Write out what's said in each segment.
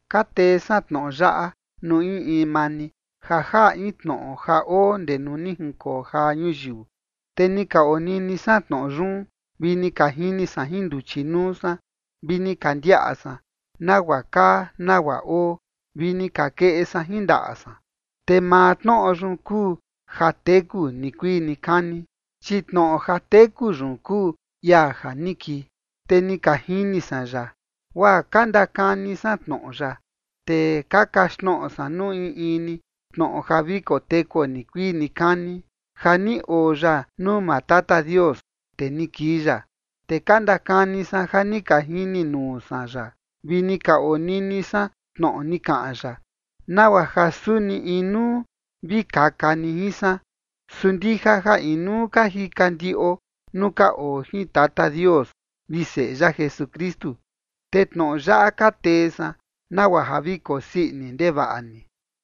Ka tee san tnoꞌo yaꞌa nuu in in maa ni ja jaꞌa in Tnoꞌo ja oo ndee nuu ni jinkoo jaa ñuyiu, te ni ka onini san Tnoꞌo yun, vi ni ka jini san jin nduchi nuu san vi ni ka ndiaꞌa san, nagua kaa nagua oo, vi ni ka keꞌe san jin ndaꞌa san, te maa Tnoꞌo yun kuu ja teku nikuii nikani. Chi Tnoꞌo ja teku yun kuu ia ja ni kii, te ni ka jini san ya, guaa ka ndakani san tnoꞌo ya, te ka kaxtnoꞌo san nuu in in ni Tnoꞌo ja vi kotekuo nikuii nikani ja ni oo ya nuu maa Tata Dios, te ni kii ya. Te ka ndakani san ja ni ka jini nuu san ya vi ni ka onini san tnoꞌo ni kaꞌan ya, nagua ja suni inuu vi kaka ni jin san, su ndija ja inuu ka jika ndiꞌo nuu ka oo jin Tata Dios vi Seꞌe ya Jesukristu. Te tnoꞌo yaꞌa ka tee san, nagua ja vi kosii ini ndevaꞌa ni.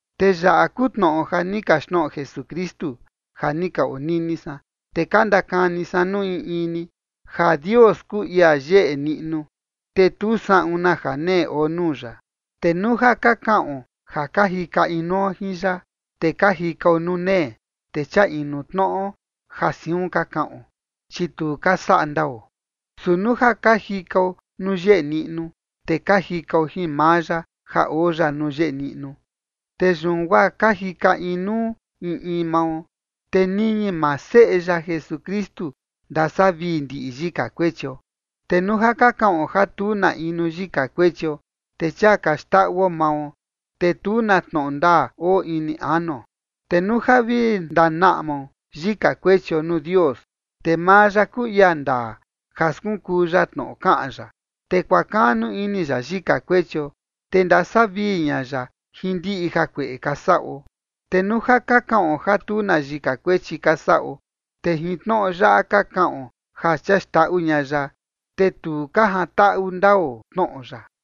Te yaꞌa kuu tnoꞌo ja ni kaxtnoꞌo Jesukristu ja ni ka onini san, te ka ndakani san nuu in in ni, ja Dios kuu ia yeꞌe niꞌnu, te tu saꞌun na janee oo nuu ya. Te nuu ja ka kaꞌon ja ka jika inuo jin ya, te ka jikao nuu nee, te chia inu tnoꞌo ja siun ka kaꞌon, chi tu ka saꞌa ndao. Su nuu ja ka jikao nuu yeꞌe niꞌnu, te ka jikao jin maa ya ja oo ya nuu yeꞌe niꞌnu, te yun guaa ka jika inuu in in mao, te niñi maa Seꞌe ya Jesukristu ndasavii ndiꞌi yika kuechio. Te nuu ja ka kaꞌon ja tu na inu yika kuechio, te chia ka xndaꞌuo mao, te tu na tnoꞌo ndaa oo ini anuo. Te nuu ja vi ndanaꞌmao yika kuechio nuu Dios, te maa ya kuu ia ndaa ja skunkuu ya tnoꞌo kaꞌan ya, te kuakaꞌnu ini ya yika kuechio, te ndasavii ña ya jin ndiꞌi jakueꞌe ka saꞌo. Te nuu ja ka kaꞌon ja tu na yika kuechi ka saꞌo, te jin tnoꞌo yaꞌa ka kaꞌon ja chia xndaꞌu ña ya, te tu ka jantaꞌu ndao tnoꞌo ya.